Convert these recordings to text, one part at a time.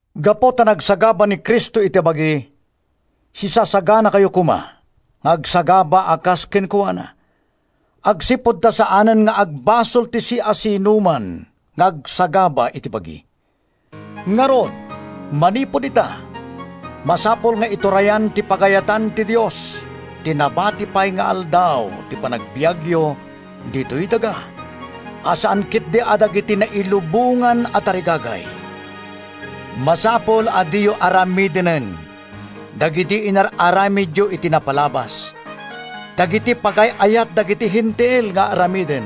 Gapu ta nagsagaba ni Cristo iti bagi, sisasaganakayo koma nga agsagaba a kas kenkuana, agsipud ta saanen nga agbasol ti siasinoman nga agsagaba iti bagi. Ngarud, manipud ita, masapul nga iturayan ti pagayatan ti Dios ti nabati pay nga aldaw ti panagbiagyo ditoy daga, a saan ketdi a dagiti nailubongan a tarigagay. Masapul a diyo aramidenen dagidi inar-aramidyo iti napalabas—dagiti pagay-ayat dagiti Hentil nga aramiden.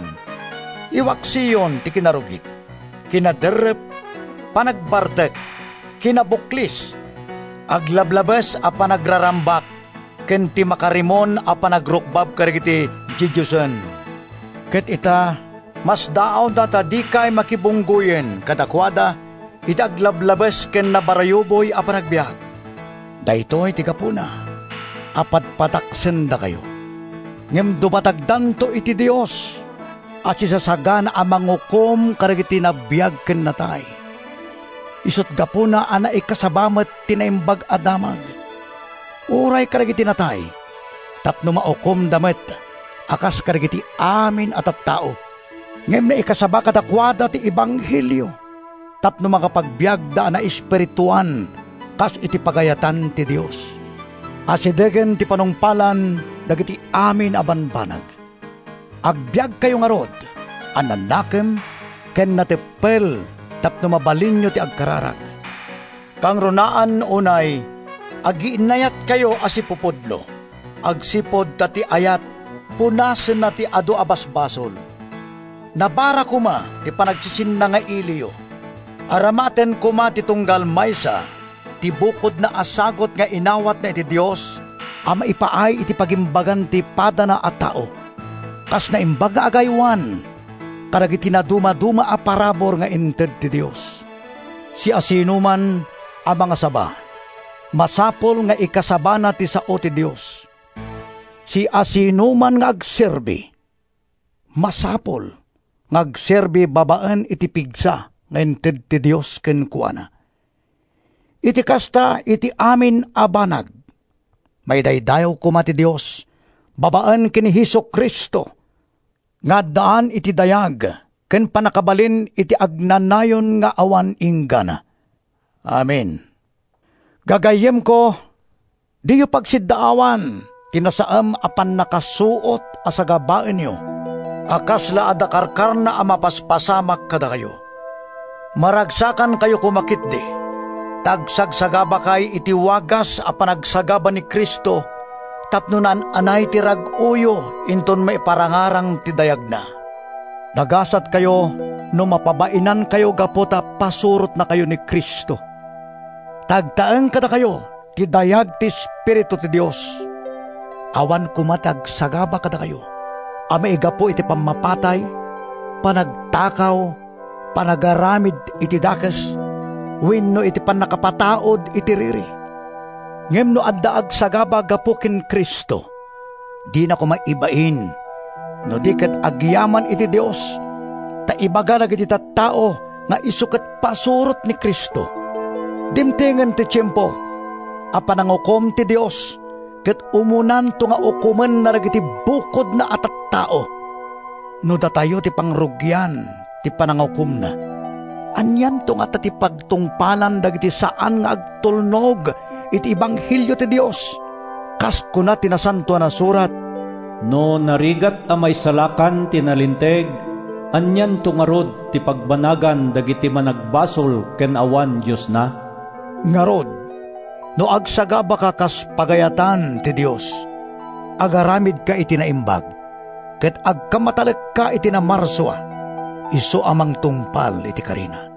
Iwaksiyon ti kinarugit, kinaderrep, panagbartek, kinabuklis, aglablabes a panagrarambak ken ti makarimon a panagrukbab kadagiti didiosen. Ket ita, masdaawda ta dikay makibunggoyen kadakuada iti aglablabes ken nabarayuboy a panagbiag. Daytoy ti gapuna a padpadaksendakayo. Ngem dumatagdanto iti Dios a sisasagana a mangukom kadagiti nabiag ken natay. Isut’ gapuna a naikasaba met ti Naimbag a Damag uray kadagiti natay tapno maukomda met a kas kadagiti amin a tattao. Ngem naikasaba kadakuada ti ebanghelio tapno makapagbiagda a naespirituan kas iti pagayatan ti Dios. Asidegen ti panungpalan dagiti amin a bambanag. Agbiagkayo ngarud a nanakem ken nateppel tapno mabalinyo ti agkararag. Kangrunaan unay, agiinnayatkayo a sipupudno agsipud ta ti ayat punasenna ti adu a basbasol. Nabara koma ti panagsisinnangailiyo. Aramaten koma ti tunggal maysa ti bukodna a sagut nga inawatna iti Dios a maipaay iti pagimbagan ti padana a tao, kas naimbag nga agaywan kadagiti nadumaduma a parabur nga inted ti Dios. Siasinoman a mangasaba, masapul nga ikasabana ti sao ti Dios. Siasinoman nga agserbi, masapul nga agserbi babaen iti pigsa nga inted ti Dios kenkuana. Iti kasta, iti amin a banag, maidaydayaw koma ti Dios babaen ken ni Jesu-Cristo, nga addaan iti dayag ken pannakabalin iti agnanayon nga awan inggana. Amen. Gagayyemko, diyo pagsiddaawan ti nasaem a pannakasuot a sagabaenyo a kasla adda karkarna a mapaspasamak kadakayo. Maragsakankayo koma ketdi ta agsagsagabakay iti wagas a panagsagaba ni Cristo tapno naan-anay ti rag-oyo inton maiparangarang ti dayagna. Nagasatkayo no mapabainankayo gapu ta pasurotnakayo ni Cristo; ta agtaeng kadakayo ti dayag ti Espiritu ti Dios. Awan koma ti agsagaba kadakayo a maigapu iti pammapatay, panagtakaw, panagaramid iti dakes, wenno iti panangpataud iti riri. Ngem no adda agsagaba gapu ken Cristo, dina koma ibain no di ket agyaman iti Dios ta ibaga dagiti tattao nga isu ket pasurot ni Cristo. Dimtengen ti tiempo a panangukom ti Dios ket umunanto nga ukomenna dagiti bukodna a tattao. No datayo ti pangrugian ti panangukomna, anianto ngata ti pagtungpalan dagiti saan nga agtulnog iti ebanghelio ti Dios? Kas kuna ti Nasantoan a Surat: “No narigat a maisalakan ti nalinteg, Anianto ngarud ti pagbanagan dagiti managbasol ken awan Diosna?” Ngarud, no agsagabaka kas pagayatan ti Dios, agaramidka, iti naimbag ket agkammatalekka iti Namarsua, isu a mangtungpal iti karina.